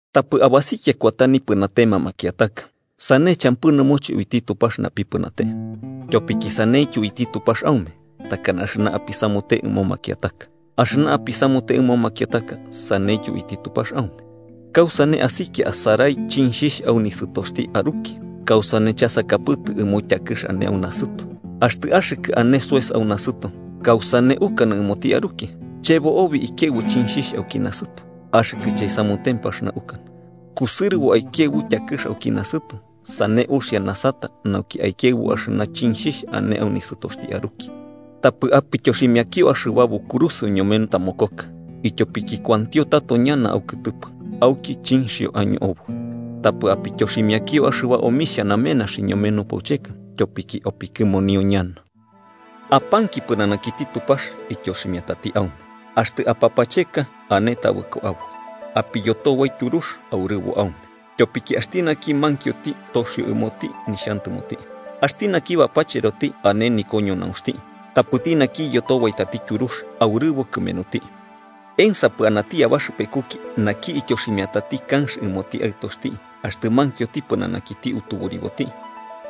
“Tapɨ abasikia kuata nipɨnatema makiataka, sane champɨ nɨmoche uiti Tupax napipɨnate. Tyopiki saneityo uiti Tupax aume takana axɨna apisamute ɨmo makiataka. Axɨna apisamute ɨmo makiataka, saneityo uiti Tupax aume. ¿Kausane asikia asarai chinxhixh au nisɨtoxti aruki, kausane chasakapɨtɨ ɨmo tyakɨx ane au nasɨto? Axtɨ axɨkɨ ane soes au nasɨto, ¿kausane ukanɨ ɨmoti aruki: ‘Chebo obi ikiaɨbu chinxhixh auki nasɨto’? ¡Axɨkɨ chaisamutempɨ axɨna ukanɨ!, kusɨrɨbo aikiaɨbu tyakɨx auki nasɨto, sane uxia nasata nauki aikiaɨbu axɨna chinxhixh ane au nisɨtoxti aruki. “Tapɨ apityoximiakio axɨba bukurusɨo ñome tamokoka, ityopiki kuantio tato ñana aukɨtɨpɨ auki chinxhio año oboi. Tapɨ apityoximiakio axɨba omixhia namenaxi ñome nupaucheka, ityopiki opikɨmonio ñana. “Apanki pɨnanakiti Tupax, ityoximiatati aume. Axtɨ apapacheka, ane tabɨko aboi. Apiyotobai tyurux, aurɨbo aume. Tyopiki axti naki mankioti, toxio ɨmoti nixhantɨmoti. Axti naki bapacheroti ane nikoñonaunxti. Tapɨti naki iyotobaitati tyurux, aurɨbo kɨmenuti. “¿Ensapɨ anati abaxɨpekuki naki ityoximiatati kanx ɨmoti aɨtoxti axtɨ mankioti pɨnanakiti utuburiboti?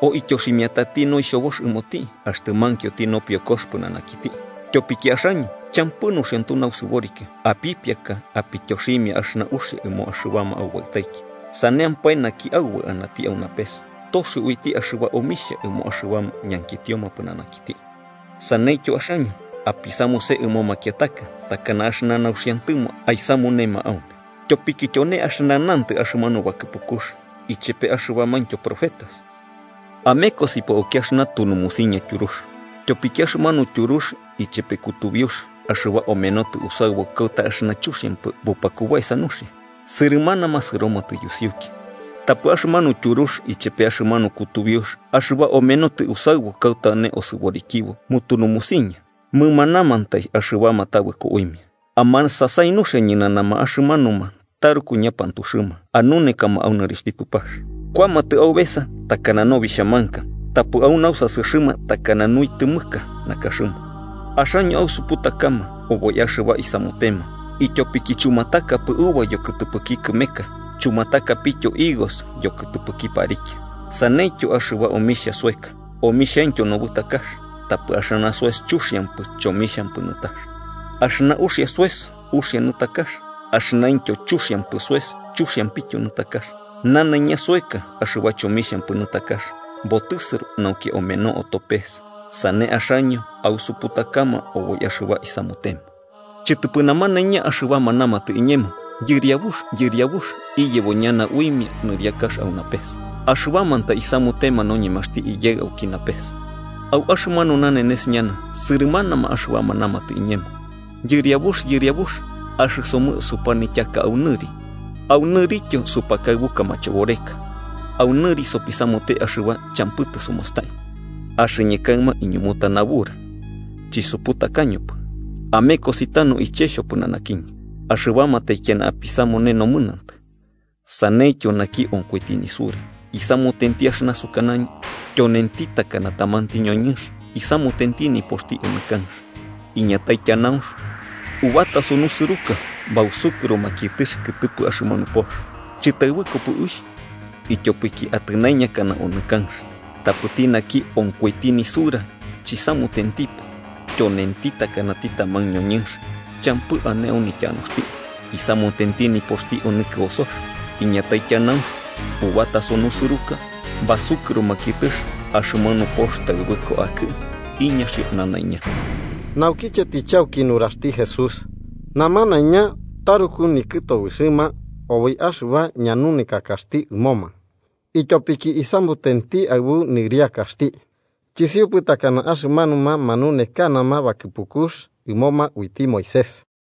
¿O aityoximiati noixhobox ɨmoti axtɨ mankioti nopiokox pɨnanakiti? Tyopiki axaño, champɨ nuxiantu nausɨboriki, apipiaka apityoximia axɨna uxia ɨmo axɨbama aubaɨtaiki, ¡saneampae naki Aubaɨ anati au napes toxio uiti axɨba omixhia ɨmo axɨbama ñankitioma pɨnanakiti! “Saneityo, axaño apisamuse ɨmo makiataka takana axɨna nauxiantɨmo aisamunema aume. Tyopiki tyone axɨna nantɨ axɨmanu bakɨpukux ichepe axɨbamaintyo profetas. “Amekosipo auki axɨna tunumusiña tyurux. Tyopiki axɨmanu tyurux ichepe kutubiux axɨba omenotɨ usaɨbu kauta axɨna chuxiampɨ bupakubaesa nuxia, sɨrɨmanama sɨromatɨ yusiuki. Tapɨ axɨmanu tyurux ichepe axɨmanu kutubiux axɨba omenotɨ usaɨbu kauta ane osɨborikibo mutunumusiña, mɨmanamantai axɨbama tabɨko uimia. “Amasasai nuxia ñɨnanama axɨmanuma taruku ñapantuxɨma anunekama au nɨrixhti Tupax. Kuamatɨ aubesa takana nobixhamanka, tapɨ au nausasɨxɨma takana nuitɨmɨka nakaxɨma. Axaño ausuputakama oboi axɨba isamutema, ityopiki chumatakapɨ uva yokɨtɨpɨki kɨmeka chumatakapityo higos yokɨtɨpɨki parikia. Saneityo, axɨba omixhia soeka, omixhaintyo nobɨtax, tapɨ axɨna soes chuxiampɨ chomixhampɨ nɨtax. Axɨna uxia soes uxia nɨtakax, axɨnaintyo chuxiampɨ soes chuxiampityo nɨtakax. Nanaiña soeka axɨba chomixhampɨ nɨtakax, botɨsɨro nauki ameno oto pees. Sane axaño ausuputakama oboi axɨba isamutema. “Chɨtɨpɨ namanaiña axɨbama namatɨ iñemo: ‘Yɨriabux, Yɨriabux’, iyebo ñana uimia au nɨriakax au napes, axɨbamantai isamutema noñemaxti Iyaɨ auki napes. Au axɨmanu nanenes ñana sɨrɨmanama axɨbama namatɨ iñemo: ‘Yɨriabux, Yɨriabux, axɨsomɨ supanityaka au nɨri, au nɨrityo supakaɨbuka machoboreka, au nɨri sopisamute axɨba champɨ tɨsumastai.’ Axɨñɨ kaɨma iñumuta nabura: ‘Chisuputakañopɨ. ¡Amekosi tanu iche xhopɨnanakiñɨ, axɨbama taikiana apisamune nomɨnantɨ!’ “Sanentityo naki onkoiti nisura, isamutenti axɨna sukanañɨ, tyonenti takana tamanti ñoñɨnx isamutenti nipoxti onɨ kanx. Iñatai tyanaunx, ubataso nusɨruka bausukɨro makiɨtɨx kɨtɨpɨ axɨmanu pox. Chɨtaɨbɨkopɨ uixh ityopiki atɨnaiñakana onɨ kanx. Tapɨti naki onkoiti nisura chisamutentipɨ, tyonenti takanati taman ñoñɨnx champɨ ane au nityanuxti isamutenti nipoxti onɨ kɨosox. Iñatai tyanaunx, ubataso nusɨruka, basukɨro makiɨtɨx axɨmanu pox taɨbɨko akɨ. ¡Iñaxio nanaiña!” Naukiche tɨchauki nuraxti Jesús, namanaiña taruku nikɨtobɨxɨma oboi axɨba ñanunekakaxti ɨmoma, ityopiki isamutenti aɨbu nɨriakaxti, chisiupɨ takana axɨmanuma manunekanama bakɨpukux uiti Moisés ɨmoma.